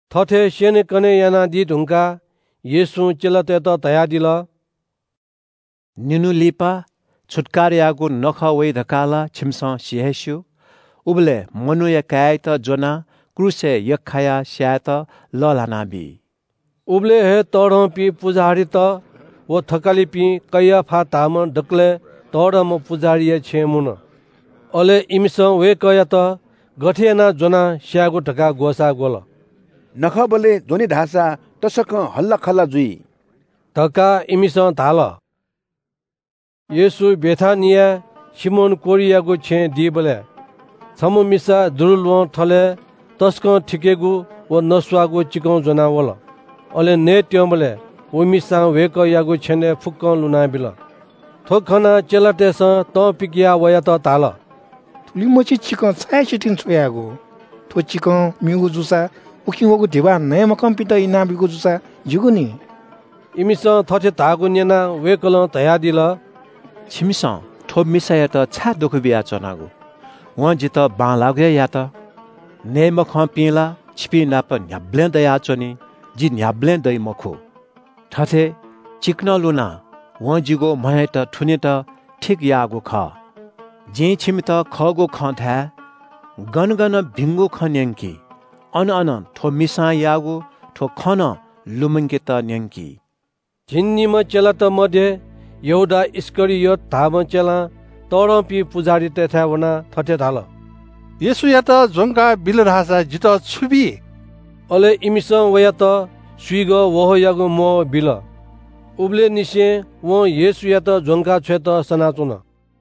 थथे स्‍यनेकने यानादी धुंकाः येशूं चेलातय्‌त धयादिल – “निन्‍हु लिपा छुत्‍काराया नखः वइ धकाः ला छिमिसं सि हे स्‍यू। उबलय् मनूया काय्‌यात ज्‍वनाः क्रूसय् यख्‍खायाः स्‍यायेत लःल्‍हानाबी।” उबलय् हे तःधंपिं पुजाहारीत व थकालिपिं कैयाफा धाःम्‍ह दकलय् तःधंम्‍ह पुजाहारीया छेँय् मुन। अले इमिसं वय्‌कःयात गथे यानाः ज्‍वनाः स्‍यायेगु धकाः ग्‍वसाः ग्‍वल। “नखःबलय् ज्‍वने धाःसा तसकं हल्‍लाखल्‍ला जुइ” धकाः इमिसं धाल। येशू बेथानियाय् सिमोन कोह्रियागु छेँय् दीबलय् छम्‍ह मिसा दुरूल्‍वहं थलय् तसकं थिकेगु व नस्‍वाःगु चिकं ज्‍वनाः वल। अले नयेत्‍यंबलय् व मिसां वय्‌कःयागु छेनय् फुक्‍कं लुनाबिल। थ्‍व खनाः चेलातय्‌सं तं पिकयाः वयात धाल – “थुलिमछि चिकं छाय् सितिं छ्वयागु? थ्‍व चिकं म्‍यूगु जूसा उकिं वःगु धिबा नये मखंपिन्‍त इनाब्‍यूगु जूसा ज्‍यूगु नि।” इमिसं थथे धाःगु न्‍यनाः वय्‌कलं धयादिल – “छिमिसं थ्‍व मिसायात छाय् दुःख बियाच्‍वनागु? वं जितः बांलाःगु हे यात। नये मखंपिं ला छिपिंनाप न्‍ह्याबलें दयाच्‍वनी। जि न्‍ह्याबलें दइ मखु। थथे चिकनं लुनाः वं जिगु म्‍हयात थुनेत ठीक याःगु खः। जिं छिमित खःगु खँ धाये – गन गन भिंगु खँ न्‍यंकी, अन अन थ्‍व मिसां याःगु थ्‍व खँ नं लुमंकेत न्‍यंकी।” झिंनिम्‍ह चेलात मध्‍ये यहूदा इस्‍करियोत धाःम्‍ह चेलां तःधंपिं पुजाहारीतय्‌थाय् वनाः थथे धाल – “येशूयात ज्‍वंका बिल धाःसा जितः छु बी?” अले इमिसं वयात स्‍विगः वहःयागु म्‍वहः बिल। उबलय् निसें वं येशूयात ज्‍वंका छ्वयेत सनाच्‍वन।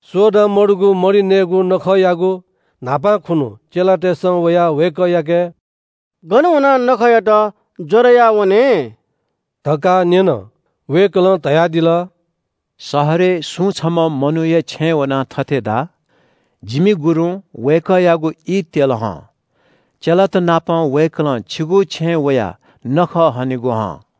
सोडा मतःगु मरि नयेगु नखःयागु न्‍हापां खुन्‍हु चेलातय्‌सं वयाः वय्‌कःयाके – “गन वनाः छुत्‍काराया नखःयात ज्‍वरय् याः वने?” धकाः न्‍यन। वय्‌कलं धयादिल – “शहरय् सुं छम्‍ह मनूयागु छेँय् वनाः थथे धा – ‘जिमि गुरुं वय्‌कःयागु ई त्‍यल हं। चेलातनापं वय्‌कलं छिगु छेँय् वयाः छुत्‍काराया नखः हनेगु हं।’”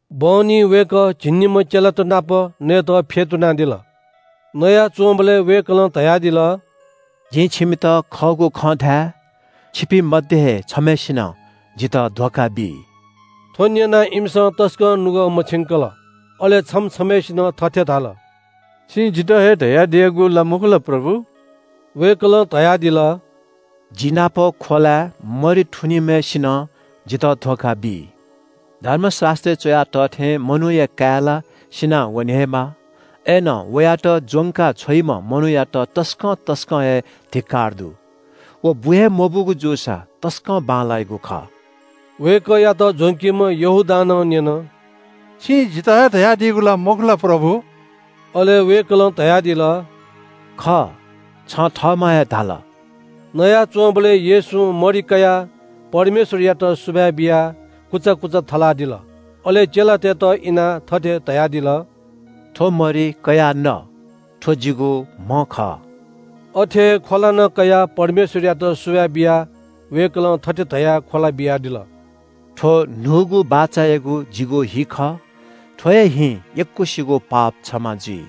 बहनी वय्‌कः झिंनिम्‍ह चेलात नाप नयेत फ्‍यतुनादिल। नयाच्‍वंबलय् वय्‌कलं धयादिल – “जिं छिमित खःगु खँ धाये – छिपिं मध्‍ये हे छम्‍हय्‌सिनं जितः धोखा बी।” थ्‍व न्‍यनाः इमिसं तसकं नुगः मछिंकल। अले छम्‍ह छम्‍हय्‌सिनं थथे धाल – “छिं जितः हे धयादियागु ला मखु ला प्रभु?” वय्‌कलं धयादिल – “जि नाप ख्‍वलाय् मरि थुनीम्‍हय्‌सिनं जितः धोखा बी। धर्मशास्‍त्रय् च्‍वया तः थें मनूया काय् ला सिनावने हे माः। अय्‌नं वयात ज्‍वंका छ्वइम्‍ह मनूयात तसकं तसकं हे धिक्‍कार दु। व बु हे मबूगु जूसा तसकं बांलाइगु खः।” वय्‌कःयात ज्‍वंकीम्‍ह यहूदां नं न्‍यन – “छिं जितः हे धयादियागु ला मखु ला प्रभु?” अले वय्‌कलं धयादिल – “खः, छं थःम्‍हं हे धाल।” नयाच्‍वंबलय् येशूं मरि कयाः परमेश्‍वरयात सुभाय् बियाः कुचा कुचा थलादिल। अले चेलातय्‌त इनाः थथे धयादिल – “थ्‍व मरि कयाः न। थ्‍व जिगु म्‍ह खः।” अथे हे ख्‍वला नं कयाः परमेश्‍वरयात सुभाय् बियाः वय्‌कलं थथे धयाः ख्‍वला बियादिल – “थ्‍व न्‍हूगु बाचायागु जिगु हि खः। थ्‍व हे हिं यक्‍वसिगु पाप क्षमा जुइ।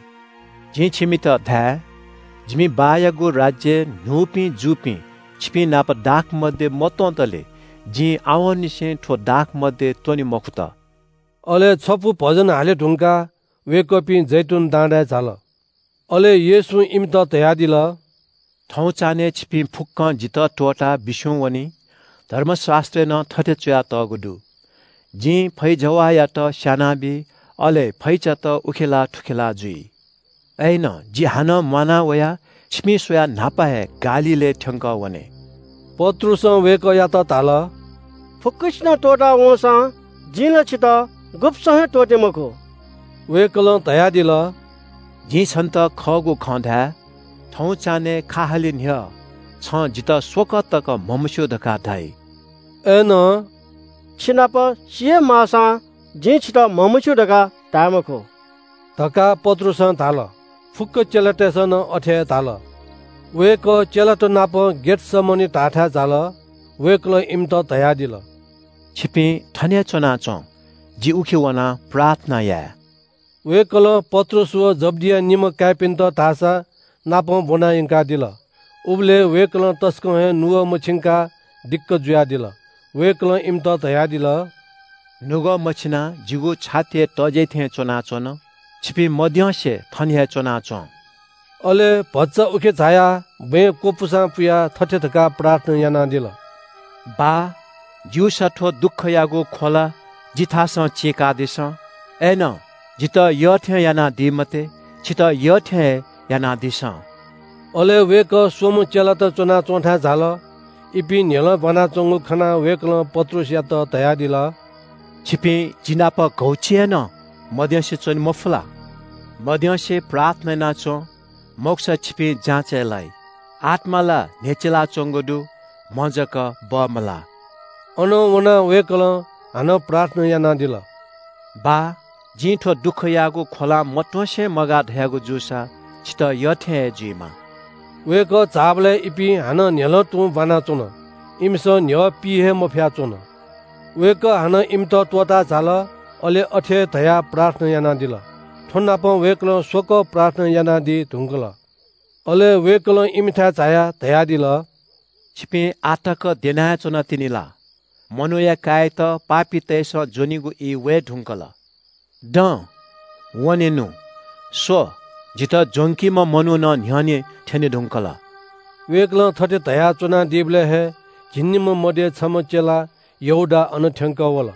जिं छिमित धाये – जिमि बाःयागु राज्‍यय् न्‍हूपिं जूपिं छिपिंनाप दाखमद्य मत्‍वंतले जिं आवंनिसें थ्‍व दाखमद्य त्‍वने मखुत।” अले छपु भजन हाले धुंकाः वय्‌कःपिं जैतून डाँडाय् झाल। अले येशूं इमित धयादिल – “थौं चान्‍हय् छिपिं फुक्‍कं जितः त्‍वःताः बिस्‍युं वनी। धर्मशास्‍त्रय् नं थथे च्‍वयातःगु दु – “‘जिं फैजवाःयात स्‍यानाबी, अले फैचात उखेलाः थुखेलाः जुइ।’ “अय्‌नं जि हानं म्‍वाना वयाः छिपिं स्‍वयाः न्‍हापा हे गालीलय् थ्‍यंकः वने।” पत्रुसं वय्‌कःयात धाल – “फुक्‍कसिनं त्‍वःता वंसां जिं ला छितः गुब्‍सं हे त्‍वःते मखु।” वय्‌कलं धयादिल – “जिं छन्‍त खःगु खँ धाये – थौं चान्‍हय् खा हाले न्‍ह्यः छं जितः स्‍वकः तक म्‍हमस्‍यू धकाः धाइ।” अय्‌नं “छिनाप सी हे माःसां जिं छितः म्‍हमस्‍यू धकाः धाये मखु” धकाः पत्रुसं धाल। फुक्‍क चेलातय्‌सं नं अथे हे धाल। वय्‌कः चेलात नाप गेतसमनी धाःथाय् झाल। वय्‌कलं इमित धयादिल – “छिपिं थन हे च्‍वनाच्‍वँ। जि उखे वनाः प्रार्थना याये।” वय्‌कलं पत्रुस व जब्‍दिया निम्‍ह काय्‌पिन्‍त धाःसानापं ब्‍वना यंकादिल। उबलय् वय्‌कलं तसकं हे नुगः मछिंकाः दिक्‍क जुयादिल। वय्‌कलं इमित धयादिल – “नुगः मछिनाः जिगु छाति हे तज्‍याइ थें च्‍वनाच्‍वन। छिपिं मद्यंसे थन हे च्‍वनाच्‍वँ।” अले भचा उखे झायाः बँय् क्‍वपुसां पुयाः थथे धकाः प्रार्थना यानादिल – “बाः, ज्‍यूसा थ्‍व दुःखयागु ख्‍वला जिथासं चीकादिसँ। अय्‌नं जितः यःथें यानादी मते, छितः यःथें हे यानादिसँ।” अले वय्‌कः स्‍वम्‍ह चेलात च्‍वनाच्‍वंथाय् झाल। इपिं न्‍ह्यलं ब्‍वानाच्‍वंगु खनाः वय्‌कलं पत्रुसयात धयादिल – “छिपिं जि नाप घौछि हे नं मद्यंसे च्‍वने मफु ला? मद्यंसे प्रार्थना याना च्‍वँ, मखुसा छिपिं जाँचय् लाइ। आत्‍मा ला न्‍ह्यचिलाच्‍वंगु दु, म्‍ह जक बमलाः।” अनं वनाः वय्‌कलं हानं प्रार्थना यानादिल – “बाः, जिं थ्‍व दुःखयागु ख्‍वलां मत्‍वंसे मगाः धयागु जूसा, छितः यःथें हे जुइमा।” वय्‌कः झाःबलय् इपिं हानं न्‍ह्यलं तुं ब्‍वानाच्‍वन। इमिसं न्‍ह्यः पी हे मफया च्‍वन। वय्‌कः हानं इमित त्‍वःताः झाल। अले अथे हे धयाः प्रार्थना यानादिल। थ्‍वनापं वय्‌कलं स्‍वकः प्रार्थना यानादी धुंकल। अले वय्‌कलं इमिथाय् झायाः धयादिल – “छिपिं आः तक द्यना च्‍वनातिनि ला? मनूया काय्‌यात पापीतय्‌सं ज्‍वनीगु ई वये धुंकल। दँ, वनेनु। स्‍व, जितः ज्‍वंकीम्‍ह मनू नं न्‍ह्यःने थ्‍यने धुंकल।” वय्‌कलं थथे धयाच्‍वनादीबलय् हे झिंनिम्‍ह मध्‍ये छम्‍ह चेला यहूदा अन थ्‍यंकः वल।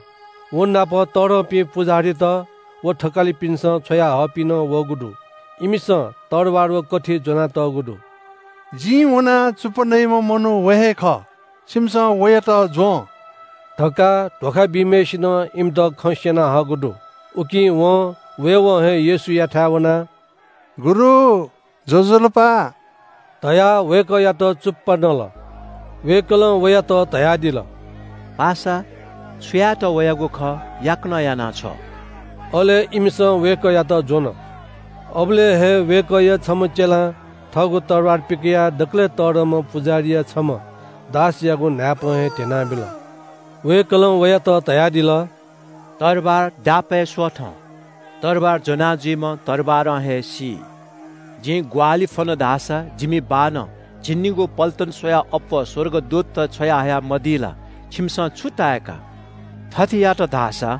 व नाप तःधंपिं पुजाहारीत व थकालिपिन्‍सं छ्वयाहःपिं नं वःगु दु। इमिसं तरवार व कथि ज्‍वनातःगु दु। “जिं वनाः चुप्‍पा नइम्‍ह मनू व हे खः, छिमिसं वयात ज्‍वँ” धकाः धोखा बीम्‍हय्‌सिनं इमित खँ स्‍यना हःगु दु। उकिं वं वयेवं हे येशूयाथाय् वनाः “गुरु, ज्‍वजलपा” धयाः वय्‌कःयात चुप्‍पा नल। वय्‌कलं वयात धयादिल – “पासा, छु यायेत वयागु खः याकनं याना छ्व।” अले इमिसं वय्‌कःयात ज्‍वन। अबलय् हे वय्‌कःया छम्‍ह चेलां थःगु तरवार पिकयाः दकलय् तःधंम्‍ह पुजाहारीया छम्‍ह दासयागु न्‍हाय्‌पं हे ध्‍यनाबिल। वय्‌कलं वयात धयादिल – “तरवार दापय् स्‍वथँ। तरवार ज्‍वनाजुइम्‍ह तरवारं हे सी। जिं ग्‍वाहालि फ्‍वन धाःसा जिमि बाःनं झिंनिगू पल्‍टन स्‍वयाः अप्‍वः स्‍वर्गदूतत छ्वयाहया मदी ला? छिमिसं छु ताय्‌का? थथे यात धाःसा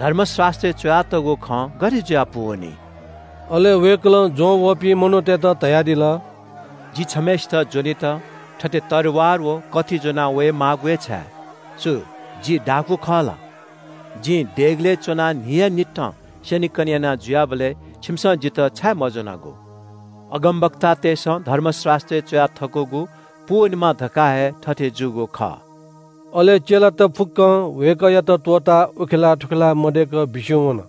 धर्मशास्‍त्रय् च्‍वयातःगु खँ गथे जुयाः पूवनी?” अले वय्‌कलं ज्‍वंवःपिं मनूतय्‌त धयादिल – “जि छम्‍हय्‌सित ज्‍वनेत थथे तरवार व कथि ज्‍वनावये माःगु छाय्? छु जि दाखुँ खः ला? जिं देगलय् च्‍वनाः न्‍हियान्‍हिथं स्‍यनेकने याना जुयाबलय् छिमिसं जितः छाय् मज्‍वनागु? अगमवक्तातय्‌सं धर्मशास्‍त्रय् च्‍वया थकूगु पूवनेमा धकाः हे थथे जूगु खः।” अले चेलात फुक्‍कं वय्‌कःयात त्‍वःताः उखेलाः थुखेलाः मदय्‌क बिस्‍युं वन।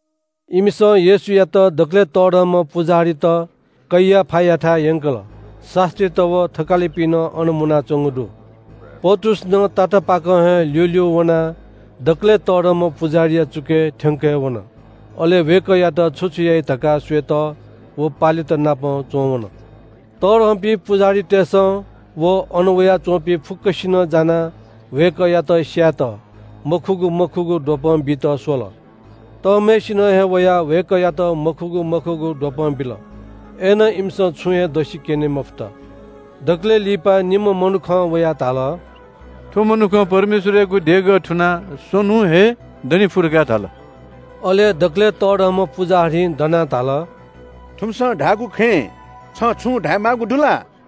इमिसं येशूयात दकलय् तःधंम्‍ह पुजाहारीत कैयाफायाथाय् यंकल। शास्‍त्रीत व थकालिपिं नं अन मुनाच्‍वंगु दु। पत्रुस नं तातापाकं हे ल्‍यूल्‍यू वनाः दकलय् तःधंम्‍ह पुजाहारीया चुकय् थ्‍यंक हे वन। अले वय्‌कःयात छु छु याइ धकाः स्‍वयेत व पालेत नाप च्‍वंवन। तःधंपिं पुजाहारीतय्‌सं व अन वयाच्‍वंपिं फुक्‍कसिनं जानाः वय्‌कःयात स्‍यायेत मखुगु मखुगु द्वपं बीत स्‍वल। तःम्‍हय्‌सिनं हे वयाः वय्‌कःयात मखुगु मखुगु द्वपं बिल। अय्‌नं इमिसं छुं हे दसि क्‍यने मफुत। दकलय् लिपा निम्‍ह मनुखं वयाः धाल – “थ्‍व मनुखं ‘परमेश्‍वरयागु देगः थुनाः स्‍वन्‍हुं हे दने फु’ धकाः धाल।” अले दकलय् तःधंम्‍ह पुजाहारीं दनाः धाल – “थुमिसं धाःगु खँय् छं छुं धायेमाःगु दु ला?”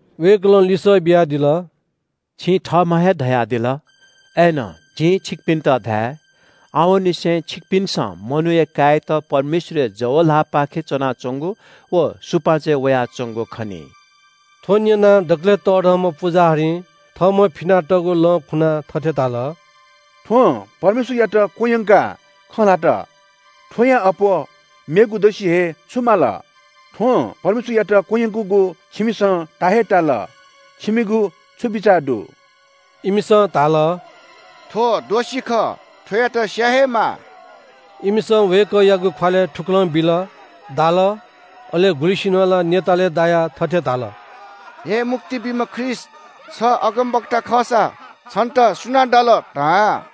वय्‌कलं लिसः बियादिल – “छिं थःम्‍हं हे धयादिल। अय्‌नं जिं छिकपिन्‍त धाये – आवंनिसें छिकपिन्‍सं मनूया काय्‌यात परमेश्‍वरया जव ल्‍हाःपाखे च्‍वनाच्‍वंगु व सुपाँचय् वयाच्‍वंगु खनी।” थ्‍व न्‍यनाः दकलय् तःधंम्‍ह पुजाहारीं थःम्‍हं फिनातःगु लं खुनाः थथे धाल – “थ्‍वं परमेश्‍वरयात क्‍वह्यंकाः खँ ल्‍हात। थ्‍वयां अप्‍वः मेगु दसि हे छु माल? थ्‍वं परमेश्‍वरयात क्‍वह्यंकूगु छिमिसं ता हे ताल। छिमिगु छु बिचाः दु?” इमिसं धाल – “थ्‍व दोषी हे खः, थ्‍वयात स्‍याये हे माः।” इमिसं वय्‌कःयागु ख्‍वालय् थुकलं बिल, दाल। अले गुलिसिनं ला न्‍यतालय् दायाः थथे धाल – “हे मुक्ति बीम्‍ह ख्रीष्‍ट, छ अगमवक्ता खःसा छन्‍त सुनां दाल, धा।”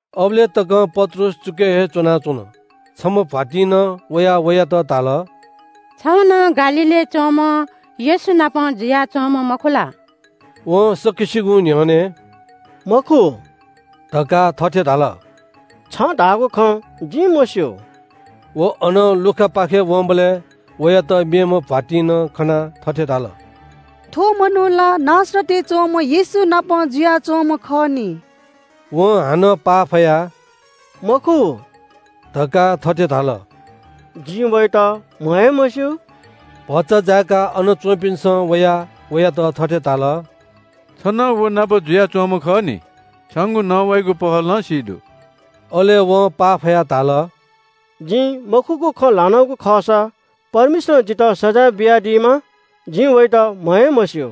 अबलय् तकं पत्रुस चुकय् हे च्‍वनाच्‍वन। छम्‍ह भ्‍वातिं नं वयाः वयात धाल – “छ नं गालीलय् च्‍वंम्‍ह येशूनापं जुयाच्‍वंम्‍ह मखु ला?” वं सकसिगुं न्‍ह्यःने “मखु” धकाः थथे धाल – “छं धाःगु खँ जिं मस्‍यू।” व अनं लुखापाखे वंबलय् वयात मेम्‍ह भ्‍वातिं नं खनाः थथे धाल – “थ्‍व मनू ला नासरतय् च्‍वंम्‍ह येशू नाप जुयाच्‍वंम्‍ह खः नि।” वं हानं पाफयाः “मखु” धकाः थथे धाल – “जिं वयात म्‍ह हे मस्‍यू।” भचा जाय्‌काः अन च्‍वंपिन्‍सं वयाः वयात थथे धाल – “छ नं व नाप जुयाच्‍वंम्‍ह खः नि। छंगु नवाइगु पहलं हे सी दु।” अले वं पाफयाः धाल – “जिं मखुगु खँ ल्‍हानागु खःसा परमेश्‍वरं जितः सजाँय बियादीमा। जिं वयात म्‍ह हे मस्‍यू।”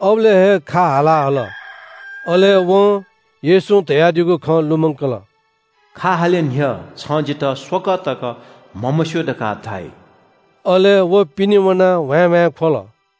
अबलय् हे ग्‍वंगः हाला हल। अले वं येशूं धयादीगु खँ लुमंकल – “खा हाले न्‍ह्यः छं जितः स्‍वकः तक म्‍हमस्‍यू धकाः धाइ।” अले व पिने वनाः ह्वाँय्‌ह्वाँय् ख्‍वल।